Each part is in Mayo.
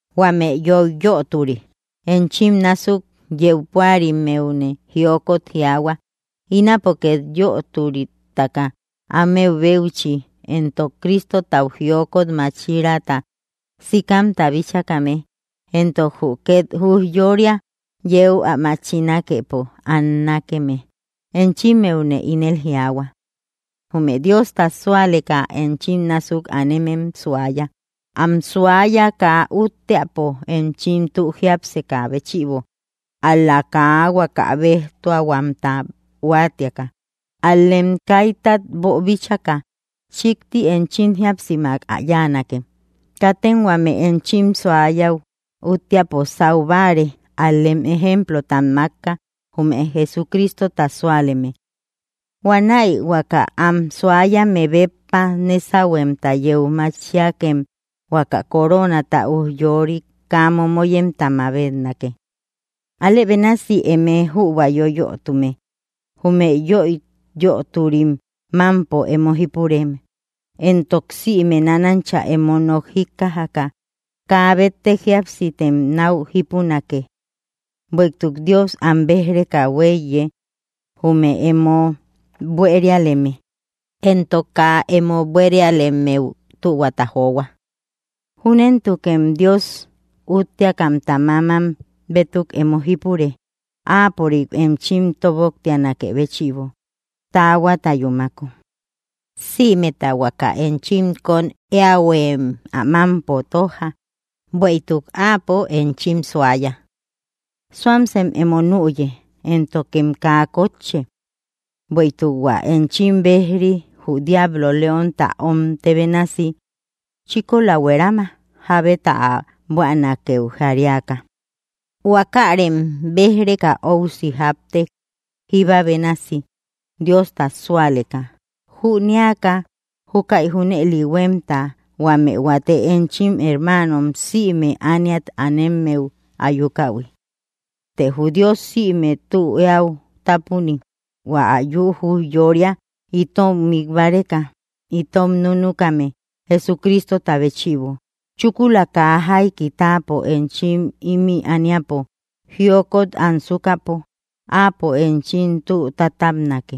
Huame yoiyöturi enchim násuk yeu púarimmeune jiokot jiaahua, ínapo két yöturitaka áme béuchi, éntok Cristotau jiokot máchiraata sikamta bíchakame, éntok jü két ujyória yeu ä machinakepo annakeme, enchimmeune ínel jiaahua: Jume Diosta súaleka enchim násuk anemem suaya, am suaya kaa útteapo, enchim tü jiápsekä béchïbo ál‑la; kaa huaka béjtuahuamta huáatiaka, ál‑lem kaitat boobíchaka chíkti enchim jíapsimak ä yáanake. Katem huame enchim suayäu úttiapo sau báare, ál‑lem ejemplotam mákka jume Jesucristota súaleme. Huanäi huaka am suayame béppa nésahuemta yeu machiakem huaka coronata ujyorik kaa momoyemta mabetnake. Alë bénasi, eme jübua yoyötume, jume yoiyöturim mámpo emo jípure. Éntok sïme nánancha emo nok jíkkajaka kaa béttek jíapsitem náu jípunake; bueïtuk: Dios am béj‑reka huéiye, jume emo buérialeme, éntok kaa emo buérialemmeu tühuata johua. Júnentukem Dios útteakamta mámam bétuk emo jípure, áapörik enchim tóbnoktianakë béchïbo taahuata yúmako. Sïmeta huaka enchim kóm éähuem ä mámpo tójja, bueïtuk áapo enchim suaya. Suamsem emo nüye, éntokem kaa kótche; bueïtuk hua enchim béj‑ri, jü diablo, leonta omtë bénasi, chíkola huerama, jábeta ä buänakeu jariaka. Huákärem béj‑reka óusi jápte, jíba bénasi Diosta súaleka, jünéaka jukai junëli huémta huame huate enchim hermanom sïme ániat anemmeu ayukähui. Të jü Dios sïme tü eäu tápuni, hua ä yü ujyória itom mik báreka itom núnukame Jesucristota béchïbo, chúkula kaa jaiki táapo enchim imï ániapo jiokot ansukäpo, áapo enchim tü tátabnake,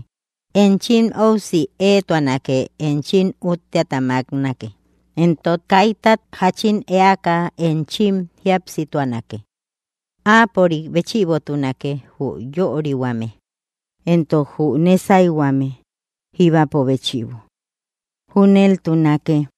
enchim óusi éetuanake, enchim útteata máknake, éntok kaitat jáchin éaka enchim jíapsituanake. Áapörik béchïbotunake jü yörihuame, éntok jü nésayhuame jíbapo béchïbo. Júneltunake.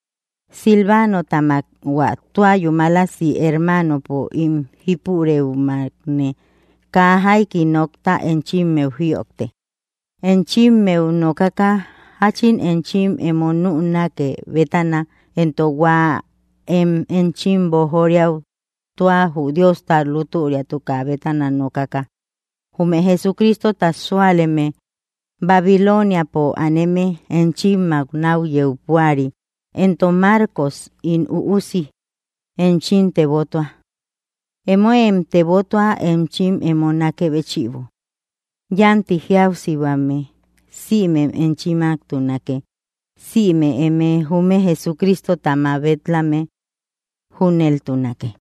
Silvánotamak, hua tua yúmalasi hermanopo ín jípurëumakne kaa jaiki nokta enchimmeu jïojtek, enchimmeu nokaka jáchin enchim emo nünake bétana éntok hua én enchim boojoriau tua jü Diosta lútüriatukä bétana nokaka. Jume Jesucristota súaleme Babiloniapo aneme enchimmak náu yeu púari, éntok Marcos ín üusi, enchim tebottua. Emóem tebotua enchim emo nákë béchïbo. Yánti jíapsihuame sïmem enchimmaktunake, sïme eme jume Jesucristota mabet‑lame. Júneltunake.